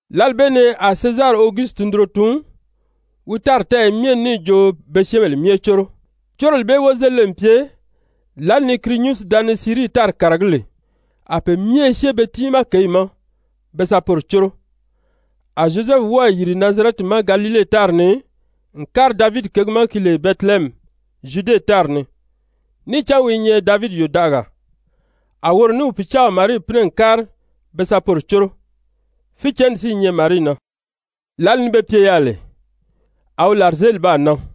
Lǎli bee ni a Sezari Ogusiti tundunro tun wi tári tɛ́ɛyɛ myɛ ni níì jo be syɛ́ɛnbèle myɛ córo. Córoli bee wozelile n pye lǎli ni Kirinyusi da ni Sirii tári kàragí lè. A pe myɛ i syée be tiimaa kěyi ma be sa poro córo. A Zyozɛfu wɔ́ɔ̀ yìri Nazarɛti ma Galile tári ni n kári Davidi kěgi ma ki lè Bɛtilehɛmi Zyude tári ni, níì cán wi i nyɛ Davidi yòdaʔagaa, a woro ní wi pìcaaw Marii pínɛ n kári be sa poro córo. Fícɛnni si i nyɛ Marii na. Lǎli ni be pye yaà lè, a wi làrizeeli baa nan,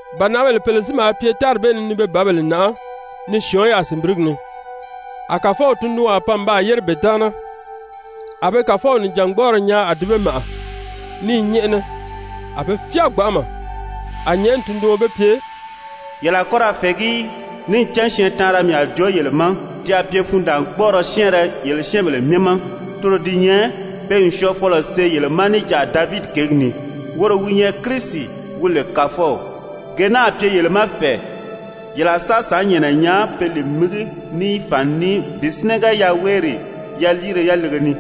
Bànaʔabèle pèle si maa pye tári bee ni ni be bǎbèle nàʔá ni syɔ̀ɔ́n yaà sìnbirigi ni. A Kàfɔw tundunwaa pan n baa yére be taana, a be Kàfɔw nìjangbɔɔrɔ nyaa a di be màʔa ní i nyɛ́ʔɛnɛ. A be fyáa gbanʔama. A nyɛ̀ʔɛni tunduɔn be pye: «Yele a kɔ́ ra fɛ̀ɛgí í, níì cán syɛɛntaanra mii a joo yele ma, ti a pye fundaangbɔɔrɔ syɛ́ɛnrɛ yele syɛ́ɛnbèle myɛ ma, toro di nyɛ pe n syɔɔfɔlɔ see yele ma níjanʔa Davidi kěgi ni, woro wi nyɛ Kirisi wi lè Kàfɔw. Gee naa a pye yele ma fɛ̀ɛ, yele a sa sàánnyɛɛnnɛ nyaa pe li mígi ní fàni ní bi sínɛgɛ yaweeri yaliire yalege ni.»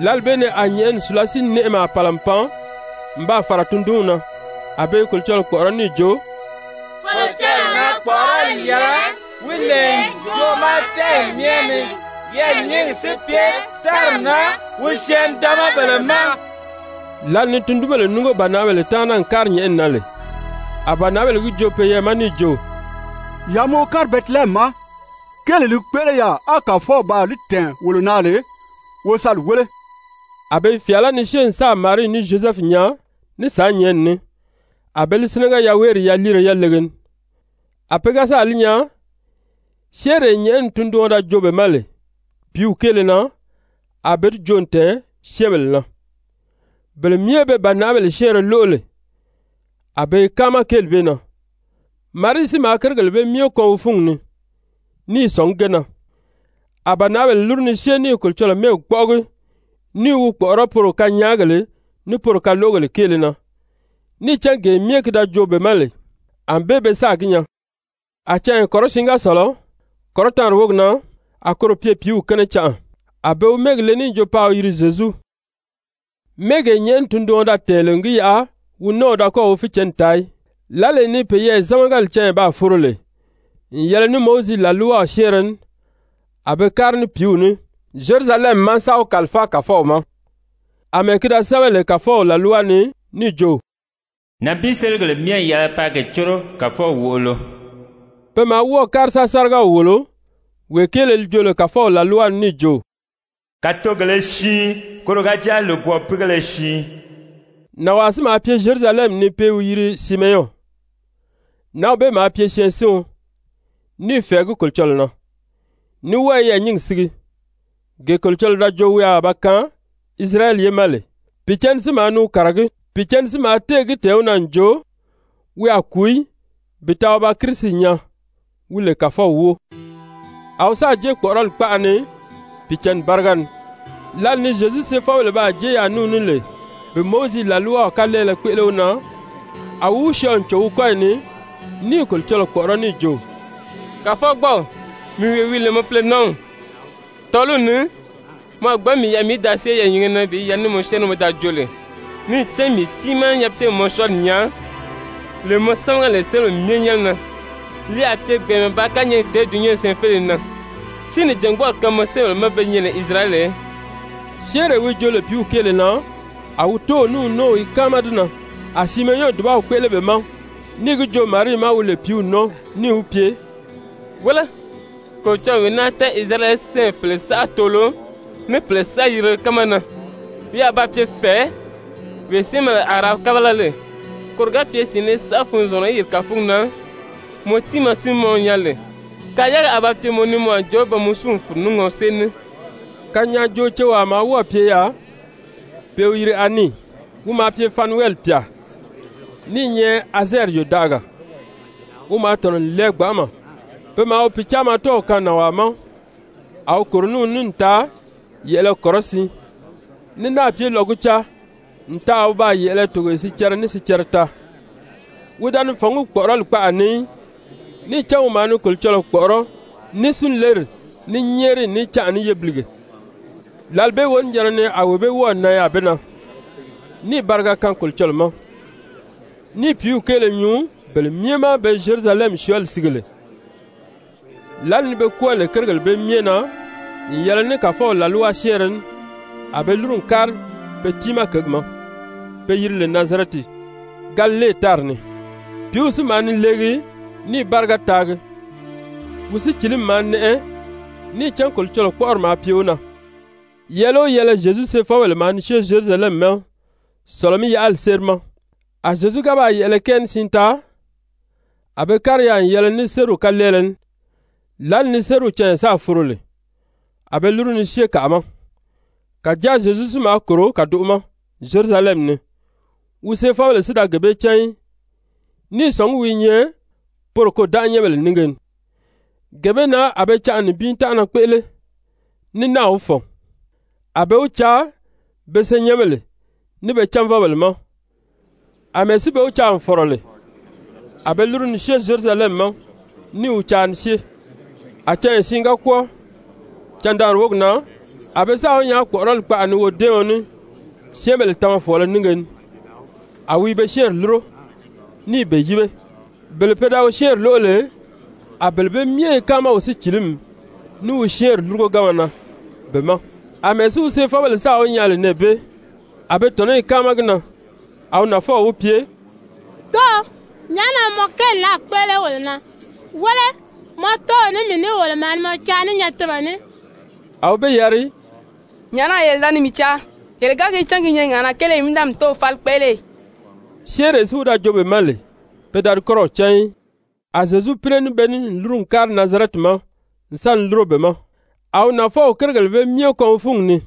Lǎli bee ni a nyɛ̀ʔɛni sùlasii-nɛʔɛmaa pàla n pan n baa fàra tundunw na, a be i Kolocɔlɔɔ kpɔ̀ʔɔrɔ́ níì jo: «Kolocɔlɔɔ na kpɔ̀ʔɔrɔli yɛlɛ wi lè ǹjoʔo ma tɛ́ɛyi myɛ ni, yɛɛ̀nyingi si pye tári na wi syɛɛn-nidaanmabèle ma.» Lǎli ni tundunbèle núngo bànaʔabèle taana n kári nyɛ̀ʔɛni na lè, a bànaʔabèle gi joo peyɛɛ ma níì jo: «Yaa maa wo kári Bɛtilehɛmi ma, kéelee li kpéʔele yaà á Kàfɔw baa li tɛ̀ɛn wolo na lè, wo sa li wéle.» A be i fyàalá ni syée n sáà Marii ní Zyozɛfu nyaa ní sàánnyɛɛnni ní, a be li sínɛgɛ yaweeri yaliire yalege ni. A pe ga sáà li nyaa, syɛ́ɛnree nyɛ̀ʔɛni tunduɔn da joo be ma lè pìíw kéele na, a be di joo n tɛ̀ɛn syɛ́ɛnbèle na. Bele myɛ be bànaʔabèle syɛ́ɛnrɛ lóʔo lè, a be i káama kéeli bee na. Marii si maa kérigèle bee myɛ kɔn wi fúngi ni ní i sɔ̀ngí ge na. A bànaʔabèle lúru ni syée ní i Kolocɔlɔɔ mɛ́ɛgi kpɔ́ʔɔgi ní i wi kpɔ̀ʔɔrɔ́ poro kanyaagèle ní poro kaloʔogèle kéele na, níì cán gee myɛ ki da joo be ma lè, ànbée be sáà gi nyaa. A canya kɔrɔsiin ga sɔ̀lɔ, kɔrɔtaanri wógi na, a koro pye pìíw kɛ́nɛ canʔa, a be wi mɛ́ɛgi le níì jo paa wi yiri Zyezu, mɛ́ɛgee nyɛ̀ʔɛni tunduɔn da tɛ̀ɛn lè n gi yaʔa wi nɔ́ɔw da kɔ́ɔ̀ wi fícɛnni taa í. Lǎlee ni peyɛɛ zámagali canya baa foro lè n yɛlɛ ní Mowizi làlwaw syɛ́ɛnrɛ ní, a be kári ní pìíw ní Zyerusalɛmi ma sa wi kàlifáa Kàfɔw ma, àmɛɛ ki da sɛ́bɛ lè Kàfɔw làlwa ni níì jo: «Nànbiiseligèle myɛ n yɛlɛ paa ge córo Kàfɔw wòʔolo.» Pe maa wɔ́ɔ̀ kári sa sárigaw wòlo wee kéele li joo lè Kàfɔw làlwa ni níì jo: «Kàtogèlē siin koro ga jáa lòbwɔɔpiigéle siin.» Nànwaa si maa pye Zyerusalɛmi ni pe i wi yiri Simeyɔn. Nǎnw bee maa pye syɛɛnsiɔn, ní i fɛ̀ɛgí Kolocɔlɔɔ na, ní wɔ́ɔ i yɛɛ̀nyingi sige, gee Kolocɔlɔɔ da joo wi a ba kaan Isirayɛli ye ma lè. Pìicǎnni si maa ni wi kàragí. Pìicǎnni si maa téè gi tɛ̀ɛn wi na n jo, wi a kùu í bi taa wi ba Kirisi nyaa, wi lè Kàfɔw wóo. A wi sáà jée kpɔ̀ʔɔrɔli kpaʔa ni Pìicǎnni báriga ni. Lǎli ni Zyezu seefɔbèle baa jée yaà ní wi ní lè bi Mowizi làlwaw kalɛɛlɛ kpéʔele wi na, a wi wi syɔɔ n cò wi kɔ́yi ni ní i Kolocɔlɔɔ kpɔ̀ʔɔrɔ́ níì jo: «Kàfɔgbɔɔw, mii wee wi lè mɔ púlonǎnw, tɔ́ɔliw ni mɔ a gbǎn mii yaʔa mii í da syée yɛɛ̀nyinge na bi yɛlɛ ní mɔ syɛ́ɛnri ní mɔ da joo lè. Níì cán mii tiimaa nyapiigèle n mɔ syɔɔli nyaa, lee mɔ sámaga lè syɛ́ɛnbèle myɛ nyɛ́nɛ na. Li a pye gbɛ̀ɛnmɛ bàā kányɛɛgi tèé dulunyanw syɛɛnfeleye na. Si nìjangbɔɔrɔ kaan mɔ syɛ́ɛnbèle ma be nyɛ lè Isirayɛli ye.» Syɛ́ɛnree wi joo lè pìíw kéele na, a wi tóow ní wi nɔ́ɔw i káama di na. A Simeyɔn dùbaw kpéʔele be ma níì gi joo Marii ma wi lè pìíw nɔ́ɔ, níì wi pye: «Wéle, Kolocɔlɔɔ n wee naa tɛ́ʔɛ Isirayɛli ye syɛ́ɛnbèle pèle saʔa toolo, ní pèle saʔa yirile kánma na. Wi a ba pye fɛ̀ɛ, wee syɛ́ɛnbèle a ra kábala lè, koro ga pye syɛ̀ɛnnɛ saʔa funzɔngurɔ í yiri kàfugi na, mɔ tiimaa si mɔ nyaa lè, kayaagi a ba pye mɔ ni mɔ a jo pe n mɔ súu n fùru ní ŋɔsée ní.» Kanyaajoocewaa maa wɔ́ɔ̀ pye yaà pe i wi yiri Ani, wi maa pye Fanuwɛli pyà, ní i nyɛ Azɛɛri yòdaʔagaa. Wi maa tɔ̀nɔ n lɛɛ gbanʔama. Pe maa wi pìcaamatɔw kaan nànwaa ma, a wi kòro ní wi ní n taa yɛ̀ʔɛlɛ kɔrɔsiin, ní náà pye lɔgucaa n taa a wi baa yɛ̀ʔɛlɛ togoye sicɛrɛ ní sicɛrɛ taa, wi da ni fɔ̀ngí kpɔ̀ʔɔrɔli kpaʔa ni í, níì cán wi maa ni Kolocɔlɔɔ kpɔ̀ʔɔrɔ́ ní súnleri, ní nyɛ́ɛriyi ní canʔa ní yébilige. Lǎli bee wonijanna ni a wee bee wɔ́ɔ̀ nan yaà be na, níì bariga kaan Kolocɔlɔɔ ma, ní i pìíw kéele nyuu bele myɛ ma be Zyerusalɛmi syɔɔli sige lè. Lǎli ni be kwɔ́ɔ lè kérigèle bee myɛ na n yɛlɛ ní Kàfɔw làlwa syɛ́ɛnrɛ ní, a be lúru n kári pe tiimaa kěgi ma, be yiri lè Nazarɛti, Galile tári ni. Pìíw si maa ni leegi ní i báriga taagi. Wi sícilimi maa nɛʔɛ, níì cán Kolocɔlɔɔ kpɔ́ʔɔri maa pye wi na. Yɛɛlɛ o yɛɛlɛ Zyezu seefɔbèle maa ni syée Zyerusalɛmi ma Sɔ̀lɔ-mí-yaʔali séri ma. A Zyezu ga baa yɛ̀ʔɛlɛ kɛɛ ní siin taa, a be kári yaà n yɛlɛ ní sériw kalɛɛlɛ ní. Lǎli ni sériw canya sáà foro lè, a be lúru ni syée kàʔa ma, kàjáa Zyezu si maa kòro kàdoʔo ma Zyerusalɛmi ni, wi seefɔbèle si da gee bee cán í, ní i sɔ̀ngí wi i nyɛ poro kôdanʔanyɛnbèle nínge ni, gee bee na a be canʔa nibin tánʔana kpéʔele, ní náà wi fɔ̀n, a be wi caa be senyɛnbèle, ní be cánvɔbèle ma. Amɛɛ si be wi caa n fɔ̀rɔ lè, a be lúru ni syée Zyerusalɛmi ma ní i wi caa ni syée. A canya siin ga kwɔ́ɔ, candaanri wógi na, a be sáà wi nyaa kpɔ̀ʔɔrɔli kpaʔa ni wodɛ́ɛɔn ní syɛ́ɛnbèle tamafɔɔlɔ nínge ni, a wi i be syɛ́ɛnri lúro, ní i be yíbe. Bele pe da wi syɛ́ɛnri lóʔo lè, a bele bee myɛ i káama wi sícilimi, ní wi syɛ́ɛnri lúrugoganma na be ma. Amɛɛ si wi seefɔbèle sáà wi nyaa lè nɛɛ bee, a be tɔ̀nɔ́ i káama gi na. A wi nafɔw wi pye: «Dóō, nyàʔá na mɔ kéeli naa kpéʔele wolo na? Wéle, mɔ tóow ní mii ní, wolo maa ni mɔ caa ní nyatinmɛ ní.» A wi be yari: «Nyàʔá na yele da ni mii caa? Yele ga gi cán ki i nyɛ ŋàʔanaga kéele mii í da mii Tóow fáli kpéʔele ì?» Syɛ́ɛnree si wi da joo be ma lè, pe da di kɔ́rɔw cán í. A Zyezu pínɛ ní be ní n lúru n kári Nazarɛti ma n sa ni lúro be ma. A wi nafɔw kérigèle bee myɛ kɔn wi fúngi ni.